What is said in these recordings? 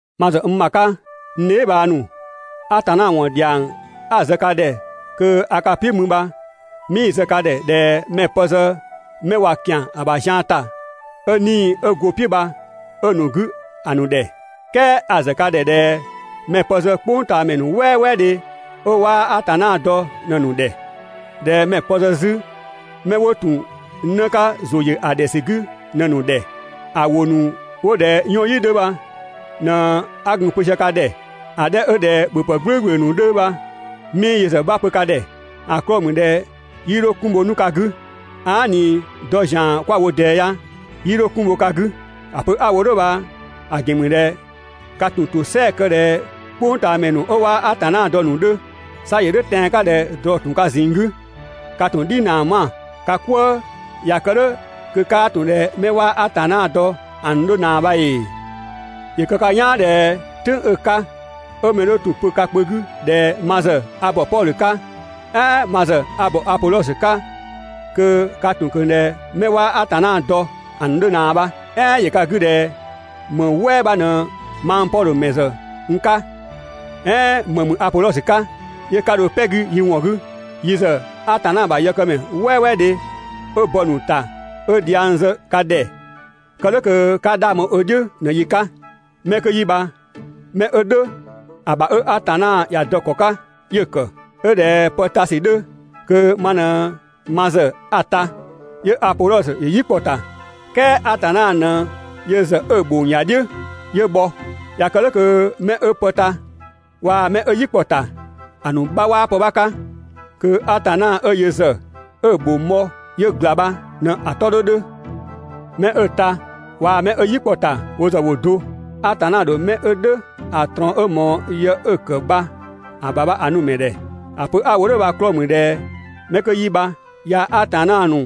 Ma ‑zë n ‑bha 'ka, n dheebhang ‑nu, Atanna ‑wɔn ‑dhiang 'a‑ zë ka ‑dhɛ kö a ka "piʋ̈ mü 'bha 'mii‑ zë ka ‑dhɛ ꞊dhɛ mɛ‑ pë zë 'mɛ (꞊wa ‑kian ‑a ‑bha zian ‑ta,) 'ö 'Nii‑ 'ö go‑ "piʋ̈ bha 'ö‑ ‑nu 'gü ‑a ‑nu ‑dhɛ. "Kɛɛ a‑ zë ka ‑dhɛ ꞊dhɛ mɛ‑ pë zë "kpʋngtaamɛ ‑nu "wɛɛdhe 'ö 'waa Atanna dɔ ꞊në‑ ‑nu ‑dhɛ. ꞊Dhɛ mɛ‑ pë zë 'zü 'mɛ 'wo ‑tun 'në 'ka ‑zʋ ‑yö ‑a ‑dhɛ ‑sü 'gü ꞊në‑ ‑nu ‑dhɛ. ‑A ‑wʋ ‑nu 'wo ꞊dhɛ 'yɔnyi 'dhö bha ꞊në 'a gun‑ pö sië ka ‑dhɛ, ‑a 'dhɛ 'ö ꞊dhɛ ‑bhöpë "gblʋ̈ʋ̈gblʋ̈ ‑nu 'dhö bha 'mii yö ‑zë 'bha pö ka ‑dhɛ, ‑a 'klɔɔ‑ ‑mü ꞊dhɛ 'yii 'dho 'kun bho 'nu ka 'gü. Aa" ꞊ni dɔ ‑zian 'kwa‑ wo ꞊dɛɛ ya, 'yii 'dho 'kun bho ka 'gü. ‑A pö 'a‑ wo "dhʋ̈ bha‑ ‑gɛn ‑mü ꞊dhɛ ka ‑tun ‑tosɛa kë ꞊dhɛ "kpʋngtaamɛ ‑nu 'ö 'waa Atanna dɔ ‑a ‑nu 'dhö. 'Sa ‑yö "dhʋ̈ tɛan‑ 'ka ꞊dhɛ ꞊drɔ‑ ‑tun ka ꞊zinng 'gü, ka ‑tun "dhinaa ‑nu 'ma‑ ka "kwëë. ꞊Ya kë "dhʋ̈ kö 'kaa ‑tun ꞊dhɛ 'mɛ 'waa Atanna dɔ ‑a ‑nu 'dhö ꞊naa bha ‑ee? ‑Yö kë ka "yaan ꞊dhɛ "tʋ̈ng 'ö‑ 'ka 'ö mɛ 'dhö ‑tun pö ka kpö 'gü ꞊dhɛ «Ma ‑zë a ‑bɔ Pɔdhö 'ka», "ɛɛn «Ma ‑zë a ‑bɔ Apodhɔsö 'ka» kö ka ‑tun ꞊kö ꞊dhɛ 'mɛ 'waa Atanna dɔ ‑a ‑nu 'dhö ꞊naa bha. "Ɛɛn ‑yö ka 'gü ꞊dhɛ ‑më "wɛɛ 'bha ꞊në mang Pɔdhö ‑mɛ ‑zë n 'ka, "ɛɛn ‑më ‑mü Apodhɔsö 'ka? ('Yö 'ka dho "pɛ‑ 'gü yi ‑wɔn 'gü?) Yi ‑zë Atanna ‑bha yëkëmɛ "wɛɛwɛɛdhe 'ö bɔ‑ ‑nu ‑ta 'ö dhiang zë ka ‑dhɛ, kë "dhʋ̈ kö 'ka 'dhang bho ö "dhiʋ̈ ꞊në‑ yi 'ka. 'Mɛ 'kö 'yi bha 'mɛ 'ö "dhʋ̈ ‑a ‑bha 'ö Atanna ‑ya dɔ‑ ‑kɔ 'ka 'yö‑ ‑kë. 'Ö ꞊dhɛ pë ta ‑sü 'dhö kö ma ꞊në ma ‑zë 'a‑ ta, 'yö Apodhɔsö ‑yö "yi kpɔ‑ ‑ta. "Kɛɛ Atanna ꞊në yö ‑zë 'ö‑ ‑bhong ‑ya "dhiʋ̈ 'yö bhɔ. ꞊Ya kë "dhʋ̈ kö 'mɛ 'ö pë ta waa‑ 'mɛ 'ö "yi kpɔ‑ ‑ta, ‑a ‑nu 'bha 'waa pë 'bha 'ka. Kö Atanna 'ö yö ‑zë 'ö‑ ‑bhong bhɔ 'yö ‑gla bha ꞊në‑ 'tɔ 'dhö 'dhö. 'Mɛ 'ö‑ ta waa‑ 'mɛ 'ö "yi kpɔ‑ ‑ta wo ‑zë ‑wo do. Atanna ‑dho 'mɛ 'ö "dhʋ̈ ‑a ꞊trɔɔn 'ö ꞊mɔɔ yë 'ö‑ ‑kë bha‑ ‑bha ‑a nu‑ ‑mɛ ‑dhɛ. ‑A pö 'a‑ wo "dhʋ̈ bha‑ 'klɔɔ‑ ‑mü ꞊dhɛ 'mɛ 'kö 'yi bha yaa‑ Atanna ‑nu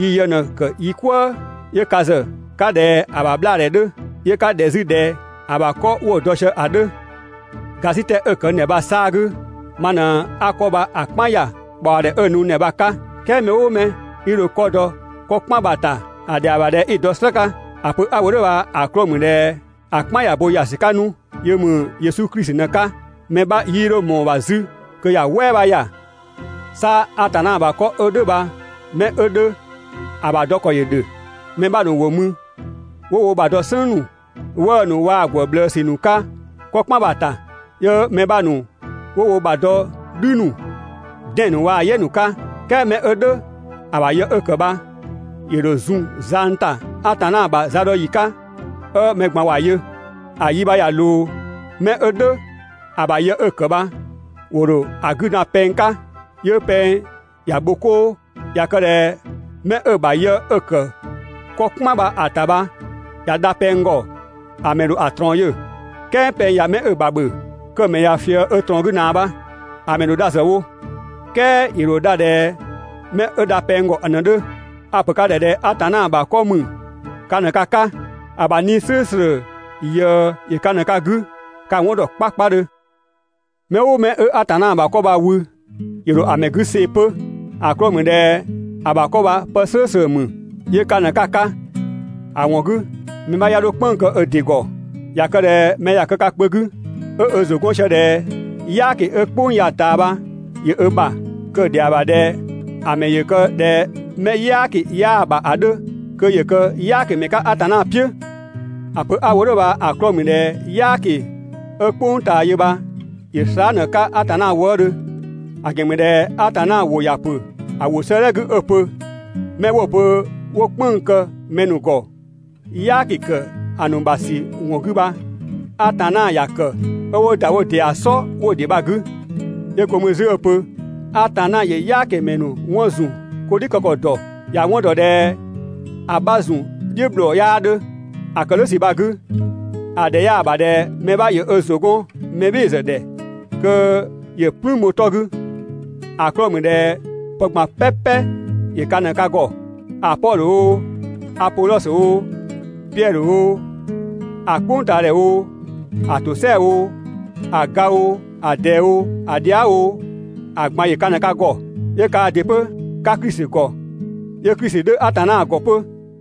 yi yë ꞊në‑ ‑kë yi 'kwëë‑. 'Yö ka ‑zë 'ka ꞊dhɛ ‑a ‑bha 'bhlaadhɛ 'dhö. 'Yö 'ka ꞊dhɛ 'zü ꞊dhɛ ‑a ‑bha 'kɔ 'wo‑ dɔ sië ‑a 'dhö. ‑Gasitɛ 'ö‑ ‑kë n ‑dhɛ bha‑ 'saa‑ 'gü, ma ꞊në 'a 'kɔ bha‑ "kpan ‑ya ꞊kpaɔdhɛ 'ö‑ nu n ‑dhɛ bha‑ 'ka. "Kɛɛ mɛ "ʋʋ mɛ 'i dho 'kɔ dɔ 'kɔ "kpan bha‑ ‑ta, ‑a ‑dhɛa ‑bha ꞊dhɛ 'i‑ dɔ "slë 'ka. ‑A pö 'a‑ wo "dhʋ̈ bha‑ 'klɔɔ‑ ‑mü ꞊dhɛ ‑a "kpan ꞊ya bo ‑ya ‑sü 'ka 'nu, yö ‑mü Yesu Klisi ꞊në‑ 'ka, mɛ 'bha 'yii 'dho ꞊mɔɔ‑ ‑bha 'zü kö ‑ya "wɛɛ bha ‑ya. 'Sa Atanna ‑bha 'kɔ 'ö "dhʋ̈ bha 'mɛ 'ö 'dhö ‑a ‑bha dɔ ‑kɔ ‑yö ‑dhö. Mɛ 'bha ‑nu ‑wo mü 'wo wo ‑bha dɔ "sënng ‑nu, 'wëë‑ ‑nu waa‑ ‑gwë ꞊bhlëësü ‑nu 'ka 'kɔ "kpan bha‑ ‑ta. 'Yö mɛ 'bha ‑nu 'wo wo ‑bha dɔ "dhü ‑nu, 'dɛn‑ ‑nu waa‑ "yɛ ‑nu 'ka. "Kɛɛ 'mɛ 'ö "dhʋ̈ ‑a ‑bha yë 'ö‑ kë bha ‑yö ‑dho zun zang ‑ta Atanna ‑bha zadɔyi 'ka 'ö mɛ ꞊gban ‑wa yö. ‑A yi bha ꞊ya ꞊loo, 'mɛ 'ö "dhʋ̈ ‑a ‑bha yë 'ö‑ ‑kë bha ‑wo ‑dho ‑a 'gü dan pɛng 'ka, 'yö pɛng ‑ya bho 'koo. ꞊Ya kë ꞊dhɛ 'mɛ 'ö‑ ‑bha yë 'ö‑ ‑kë 'kɔ "kpan bha‑ ‑ta bha ꞊ya dha pɛng ‑gɔ, ‑a ‑mɛ ‑dho ‑a ꞊trɔɔn yö. "Kɛɛ pɛng ꞊ya 'mɛ 'ö‑ ‑bha ‑bhö, kö‑ ‑mɛ ꞊ya ꞊fië 'ö ꞊trɔɔn 'gü ꞊naa bha. ‑A ‑mɛ ‑dho dha zë wo, "kɛɛ ‑yö ‑dho dha ꞊dhɛ 'mɛ 'ö dha pɛng ‑gɔ ꞊në‑ 'dhö. A‑ ‑pö ka ‑dhɛ ꞊dhɛ Atanna ‑bha 'kɔ ‑mü ka ꞊në ka 'ka, ‑a ‑bha 'Nii‑ "slʋ̈ʋ̈slʋ̈ ꞊yëë ‑yö ka ꞊në ka 'gü, ka‑ 'wɔn ‑dɔ 'kpakpadhö. Mɛ "ʋʋ mɛ 'ö Atanna ‑bha 'kɔ bha‑ wü, ‑yö ‑dho ‑a ‑mɛ 'gü see‑ 'pö. ‑A 'klɔɔ‑ ‑mü ꞊dhɛ ‑a ‑bha 'kɔ bha pë "slʋ̈ʋ̈slʋ̈ ‑mü, 'yö ka ꞊në 'ka‑ 'ka. 1co4 ‑A ‑wɔn 'gü mɛ 'bha 'ya 'dho "kpënng‑ kë ö ‑dɩ ‑gɔ. ꞊Ya kë ꞊dhɛ mɛ ꞊ya kë ka kpö 'gü 'ö ö ‑zʋ 'gɔn sië ꞊dhɛ "yaaki 'ö "kpʋng ya‑ ꞊taa bha ‑yö ö ‑bha, kö‑ ‑dhɛa ‑bha ꞊dhɛ ‑a ‑mɛ ‑yö kë ꞊dhɛ 'mɛ "yaaki 'yaa‑ ‑bha ‑a 'dhö kö ‑yö kë "yaakimɛ 'ka Atanna "piʋ̈. ‑A pö 'a‑ wo "dhʋ̈ bha‑ 'klɔɔ‑ ‑mü ꞊dhɛ "yaaki 'ö "kpʋng ꞊taa yö bha ‑yö slaa" ꞊në‑ 'ka Atanna wëëdhö. ‑A ‑gɛn ‑mü ꞊dhɛ Atanna ‑wʋ ‑ya ‑pö ‑a ‑wʋ 'sëëdhɛ 'gü 'ö‑ pö: «'Mɛ 'wo‑ pö ‑wo "kpënng‑ ‑kë mɛ ‑nu ‑gɔ "yaaki ‑kë ‑a ‑nu ‑bha ‑sü ‑wɔn 'gü bha, Atanna ‑ya ‑kë 'ö 'wo ‑da wo ‑dɩa "sɔ 'wo‑ "dhiʋ̈ bha‑ 'gü.» 'Yö go mü 'zü 'ö‑ pö: «Atanna ‑yö "yaakimɛ ‑nu 'wɔn ‑zun 'ko "dhiʋ̈ kë ‑kɔ ‑dɔ, ‑ya 'wɔn ‑dɔ ꞊dhɛ ‑a 'bha ‑zun "dhiʋ̈ ‑bhlɔɔ 'yaa 'dhö.» ‑A ‑kë "dhʋ̈ ‑sü bha‑ 'gü, ‑a ‑dhɛ 'yaa‑ ‑bha ꞊dhɛ mɛ 'bha ‑yö ö ‑zʋ 'gɔn mɛ "bhɩɩ‑ ‑zë ‑dhɛ kö ‑yö "plüün bho‑ 'tɔ 'gü, ‑a 'klɔɔ‑ ‑mü ꞊dhɛ pë ꞊gban "pɛpɛ ‑yö ka ꞊në ka ‑gɔ. ‑A Pɔdhö oo, Apodhɔsö oo, Piɛdhö oo, ‑a "kpʋngtaadhɛ oo, ‑a ‑tosɛa oo, ‑a ga oo, ‑a ꞊dɛɛ oo, ‑a dhia" oo, ‑a ꞊gban ‑yö ka ꞊në ka ‑gɔ. 'Yö kaa ‑dɩ 'pö 'ka Klisi ‑gɔ, 'yö Klisi 'dhö Atanna ‑gɔ 'pö.